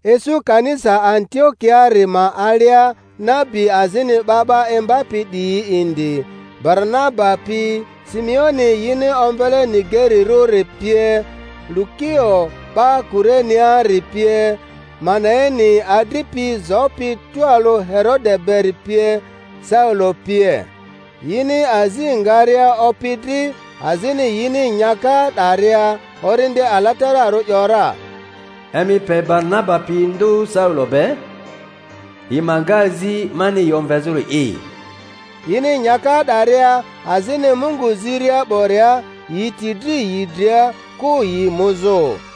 Isu kanisa Antiokiaari ma alia nabi azini 'ba 'ba imbapi 'diyi indi, Baranaba pi, Simeoni yini omvele Nigerirᴜri pie, Lukio 'ba Kureneari pie, Manaeni adripi zopi tualᴜ Herode beri pie, Saulo pie. Yini azi ngaria Opi dri azini yini nyaka 'daria, Orindi Alatararᴜ ‘yora, Emi pe Baranaba pi ndᴜ Saulo be, yi ma nga azi mani yi omvezᴜri'i. Yini nyaka 'daria azini Mungu ziria 'boria, yi ti dri yi dria, kᴜ yi muzᴜ.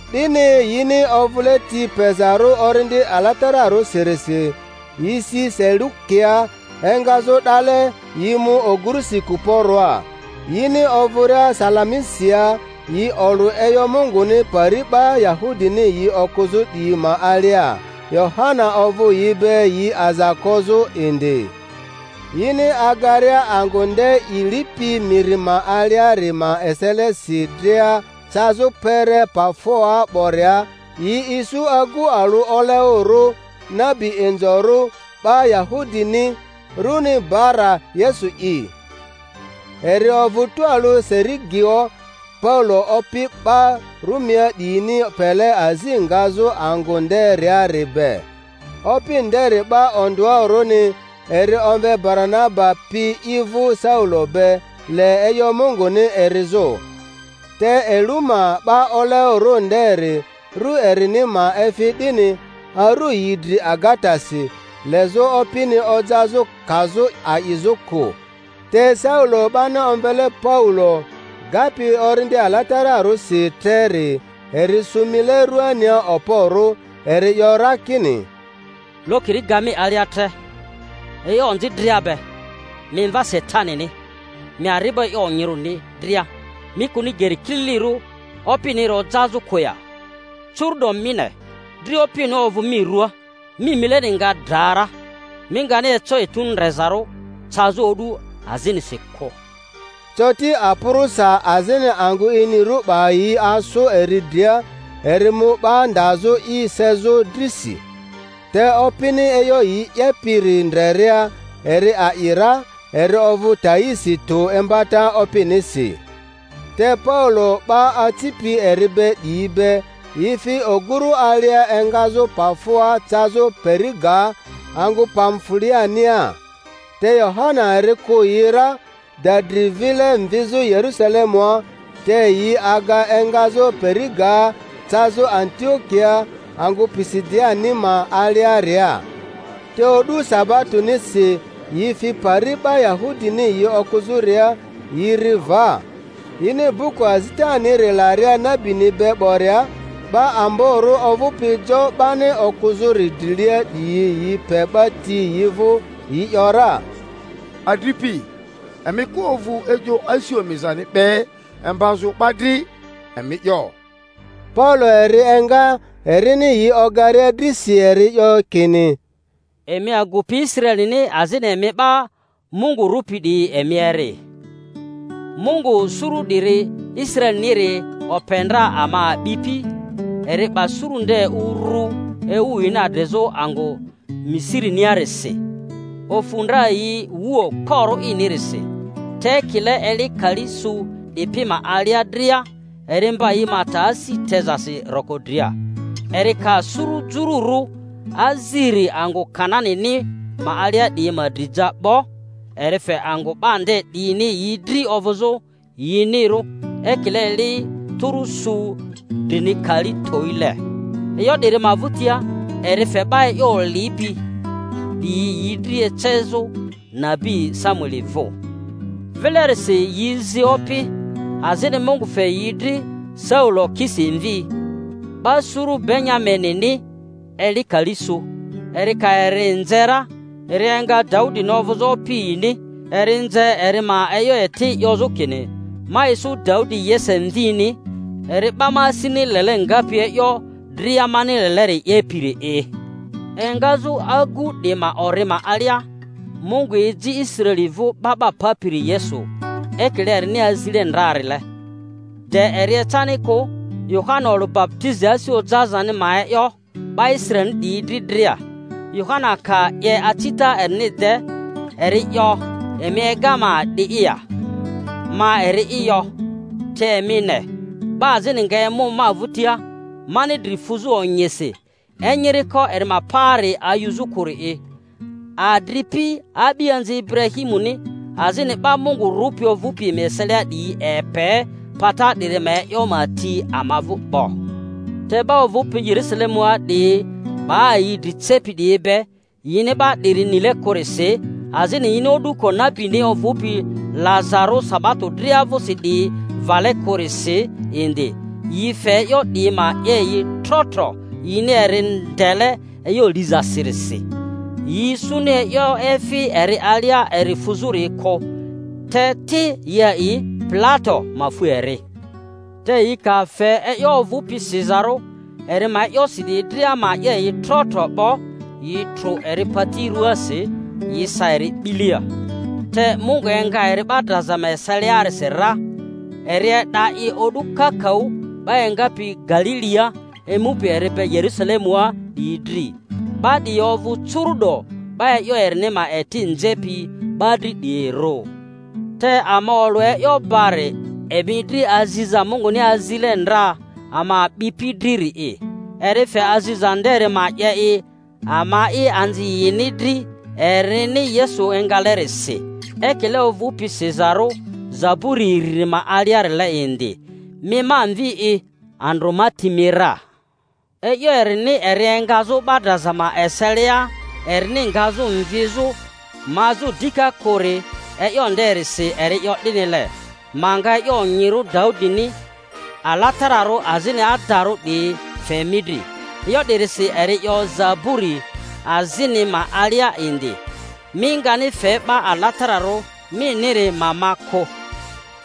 'Dini, yini ovᴜle ti pezarᴜ Orindi Alatararᴜsirisi, yi si Selukiaa; engazᴜ 'dale yi mu ogᴜrusi Kuporoa. Yini ovᴜria Salamisia, yi olᴜ e'yo Munguni pari 'ba Yahudini yi okᴜzᴜ 'diyi ma alia. Yohana ovᴜ yi be yi aza kozᴜ indi. Yini agaria angᴜ nde i lipi miri ma aliari ma eselesi dria cazᴜ kpere Pafoa 'boria, yi isu agu alᴜ oleoᴜrᴜ, nabi inzorᴜ 'ba Yahudini, runi Bara-Yesu'i. Eri ovᴜ tualᴜ Serigio Paulo opi 'ba Rumia 'diyini pele azi ngazᴜ angᴜ nderiari be. Opi nderi 'ba ondᴜarᴜni, eri omve Baranaba pi i vᴜ Saulo be, le e'yo Munguni erizᴜ. Te Eluma 'ba oleoᴜrᴜ nderi (rᴜ erini ma efi 'dini) arᴜ yi dri agatasi, lezᴜ opini ojazᴜ kazᴜ a'izᴜ kᴜ. Te Saulo 'bani omvele Paulo, gapi Orindi Alatararᴜsi treri, eri sᴜ mile ruania okporᴜ, eri 'yo ra kini, Lokiri ga mi alia tre e'yo onzi dria be, mi mva Satanini! Mi ari'bo e'yo onyirᴜni dria, mi kᴜni geri kililirᴜ Opiniri ojazᴜ kᴜ ya? Curu'do mi ne, dri Opini ovᴜ mi ruaa, mi mileni nga dra ra, mi ngani eco etu ndrezarᴜ cazᴜ o'du azinisi kᴜ. Coti apᴜrᴜsa azini angᴜ inirᴜ 'ba yi asᴜ eri dria, eri mu 'ba ndazᴜ i sezᴜ drisi. Te opini e'yo i 'yepiri ndreria eri a'i ra, eri ovᴜ taisi tᴜ imbata Opinisi. Te Paulo 'ba acipi eri be 'diyi be, yi fi oguru alia engazᴜ Pafoa cazᴜ Perigaa angᴜ Pamfuliania. Te Yohana eri kᴜ yi ra, da dri vile mvizᴜ Yerᴜsalemua; te yi aga engazᴜ Perigaa cazᴜ Antiokia angᴜ Pisidianima aliaria. Teo'du sabatoni-si yi fi pari 'ba Yahudini yi okᴜzᴜria^ yi ri va. Yini buku azitaniri laria nabini be 'boria, 'ba amborᴜ ovᴜpi jo 'bani okᴜzᴜri drilia 'diyi yi pe 'ba ti yi vᴜ, yi ‘yora, Adripi, emi ka ovᴜ e'yo asi omizani be imbazᴜ 'ba dri, emi 'yo. Paulo eri enga, erini yi ogaria drisi eri 'yo kini: Emi agupi Israelini azini emi 'ba Mungu rᴜpi 'diyi, emi eri. Mungu suru 'diri Israeliniri ope ndra ama a'bipi, eri 'ba suru nde urᴜ ewu yini adrizᴜ angᴜ Misiri-niarisi, ofᴜ ndra yi wu okporᴜ inirisi. Te ekile eli kali su 'dipi ma alia dria eri mba yi ma ta asi tezasi roko dria. Eri ka suru jururᴜ aziri angᴜ Kananini ma alia 'diyi ma dri ja 'bo, eri fe angᴜ 'ba nde 'diyini yi dri ovᴜzᴜ yinirᴜ ekile eli tᴜrᴜ su drini kali towile. E'yo 'diri ma vᴜtia, eri fe 'ba e'yo olipi 'diyi yi dri ecazᴜ nabi Samueli vᴜ. Vilerisi yi zi opi; azini Mungu fe yi dri Saulo Kisi mvi, 'ba suru Benyaminini, eli kali su. Eri ka eri nze ra, eri enga Daudini ovᴜzᴜ opi yini; eri nze eri ma e'yo eti 'yozᴜ kini, Ma isu Daudi Yese mvini, eri 'ba ma asini lele ngapi e'yo dria mani leleri 'yepiri'i. Engazᴜ agu 'di ma ori ma alia, Mungu eji Israeli vᴜ 'Ba 'ba Papiri Yesu, ekile erini azile ndrarile. De eri ecani kᴜ, Yohana olᴜ baputizi asi ojazani ma e'yo 'ba Israelini 'diyi dri dria. Yohana ka 'ye acita erini de, eri 'yo, Emi ega ma a'di'i ya? Ma eri'i yo. Te emi ne, 'ba azini nga emu ma vᴜtia, mani dri fuzᴜ onyisi enyiriko eri ma paari ayuzᴜ kᴜri'i. Adripi, a'bianzi Iburahimuni azini 'ba Mungu rᴜpi ovᴜpi emi eselia 'diyi, epe pata 'diri ma e'yo ma ti ama vᴜ 'bo. Te 'ba ovᴜpi Yerᴜsalemua 'diyi 'ba yi dri cepi 'diyi be, yini 'ba 'diri nile kᴜrisi azini yini o'duko nabini ovᴜpi lazarᴜ sabato dria vᴜsi 'diyi vale kᴜrisi indi, yi fe e'yo 'diyi ma 'ye yi trotro, yini eri ndele e'yo lizasirisi. Yi isuni e'yo efi eri alia eri fuzᴜri kᴜ, te ti yi a'i Pilato ma fu eri. Te yi ka fe e'yo ovᴜpi sizarᴜ eri ma e'yosi 'diyi dria ma 'ye yi trotro 'bo, yi trᴜ eri pati rᴜaasi, yi sa eri 'bilia. Te Mungu enga eri 'ba draza ma eseliasira; eri e'da i o'du kakaᴜ 'ba engapi Galilia emupi eri be Yerusalemua 'diyi dri, 'ba 'diyi ovᴜ curu'do 'ba e'yo erini ma eti nzepi 'ba dri 'diyirᴜ. Te ama olᴜ e'yo bari emi dri aziza Munguni azile ndra ama a'bipi driri'i; eri fe aziza nderi ma 'ye i ama'i anzi yini dri erini Yesu engalerisi; ekile ovᴜpi sizarᴜ zaburi iriri ma aliarile indi, Mi ma Mvi'i, andrᴜ ma ti mi ra. E'yo erini eri engazᴜ 'ba draza ma eselia erini ngazᴜ mvizᴜ mazᴜ dika kᴜri, e'yo nderisi eri 'yo 'dinile, Ma nga e'yo onyirᴜ Daudini alatararᴜ azini adarᴜ 'diyi fe mi dri. E'yo 'dirisi eri 'yo zaburi azini ma alia indi, Mi ngani fe 'Ba Alatararᴜ miniri ma ma kᴜ.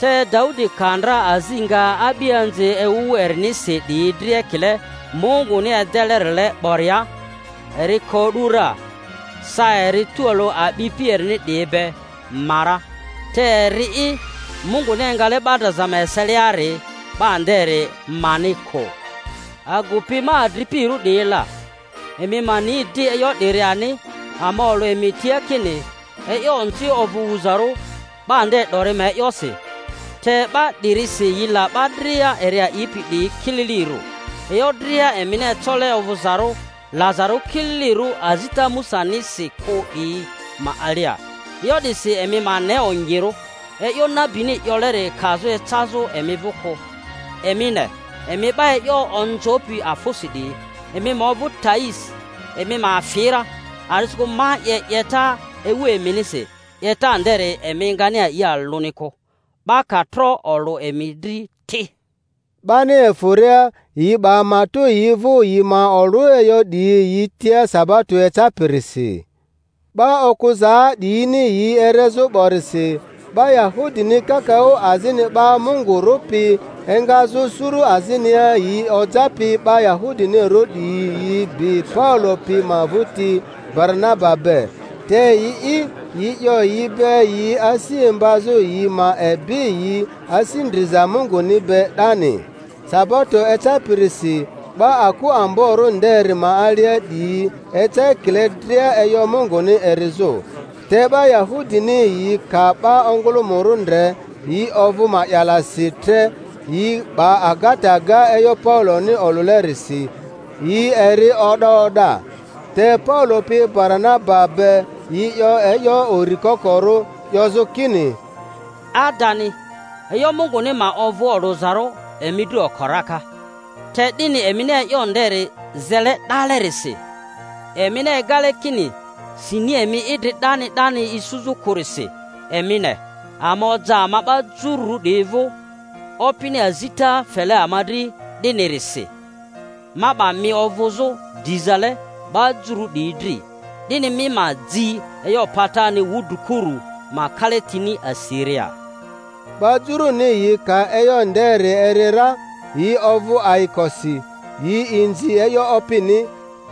Te Daudi ka ndra azi nga a'bianzi ewu erinisi 'diyi dri ekile Munguni edelerile 'boria, eri ko o'du ra, sa eri tualᴜ a'bipi erini 'diyi be, ma ra; te eri'i Munguni engale 'ba draza ma eseliari, 'ba nderi mani kᴜ. Agupi ma adripirᴜ 'diyi la, emi ma ni di e'yo 'diri ani, ama olᴜ emi tia kini e'yo onzi ovᴜ wuzarᴜ 'ba nde. 'dori ma e'yosi, te 'ba 'dirisi yi la 'ba dria eri a'ipi 'diyi kililirᴜ, e'yo dria emini ecole ovᴜzarᴜ lazarᴜ kililirᴜ azita Musanisi kᴜ 'diyi ma alia. E'yo 'disi emi ma ne onyirᴜ, e'yo nabini 'yoleri kazᴜ ecazᴜ emi vᴜ kᴜ: Emi ne, emi 'ba e'yo onzopi afᴜsi 'diyi, emi ma ovᴜ taisi, emi ma afi ra; a'disikᴜ ma 'ye 'yeta ewu eminisi, 'yeta nderi emi ngani a'i alᴜni kᴜ, 'ba ka tro olᴜ emi dri ti. 'Bani efᴜria, yi 'ba matᴜ yi vᴜ yi ma olᴜ e'yo 'diyi yi tia sabato ecapirisi. 'Ba okᴜzaa 'diyini yi erezᴜ 'borisi, 'ba Yahudini kakaᴜ azini 'ba Mungu rᴜpi engazᴜ suru azinia yi ojapi 'ba Yahudinirᴜ 'diyi yi bi Paulo pi ma vᴜti Baranaba be; te yi'i, yi 'yo yi be yi asi imbazᴜ yi. ma ebi yi asi ndriza Munguni be 'dani. Sabato ecapirisi 'ba aku amborᴜ nderi ma alia 'diyi eca ekile dria e'yo Munguni erizᴜ. Te 'ba Yahudini yi ka 'ba ongᴜlᴜmᴜrᴜ ndre, yi ovᴜ ma'yalasi tre, yi 'ba agata ga e'yo Pauloni olᴜlerisi, yi eri o'da o'da. Te Paulo pi Bara-naba be yi 'yo e'yo uri kokorᴜ, 'yozᴜ kini, Adani, e'yo Munguni ma ovᴜ olᴜzarᴜ emi dri oko raka. Te 'dini emini e'yo nderi zele 'dalerisi, emini egale kini sini emi idri 'dani 'dani isuzᴜ kᴜrisi, emi ne, ama oja ama 'ba Jururᴜ 'diyi vᴜ. Opini azita fele ama dri 'dinirisi, Ma 'ba mi ovᴜzᴜ dizale 'ba Jururᴜ 'diyi dri, 'dini mi ma ji e'yo patani wudrikuru ma kalatini asiria. 'Ba Juruni yi ka e'yo nderi eri ra, yi ovᴜ ayikosi, yi inzi e'yo Opini;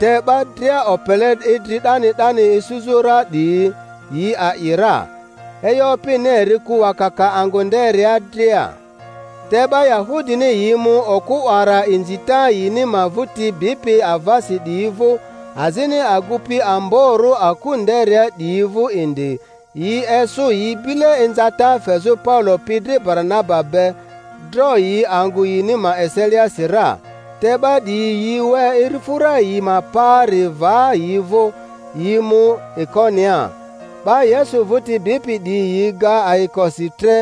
te 'ba dria opele idri 'dani 'dani isuzᴜ ra 'diyi, yi a'i ra. E'yo Opini eri ku wakaka angᴜ nderia dria. Te 'ba Yahudini yi mu okᴜ 'wara inzita yini ma vᴜti bipi avasi 'diyi vᴜ, azini agupi amborᴜ aku nderia 'diyi vᴜ indi, yi esᴜ yi bile inzata fezᴜ Paulo pi dri Baranaba be, dro yi angᴜ yini ma eseliasi ra. Te 'ba 'diyi yi we irifᴜra yi ma paari va yi vᴜ, yi mu Ikoniaa. 'Ba Yesu vᴜti bipi 'diyi yi ga ayikosi tre,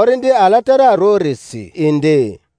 Orindi Alatararᴜrisi indi.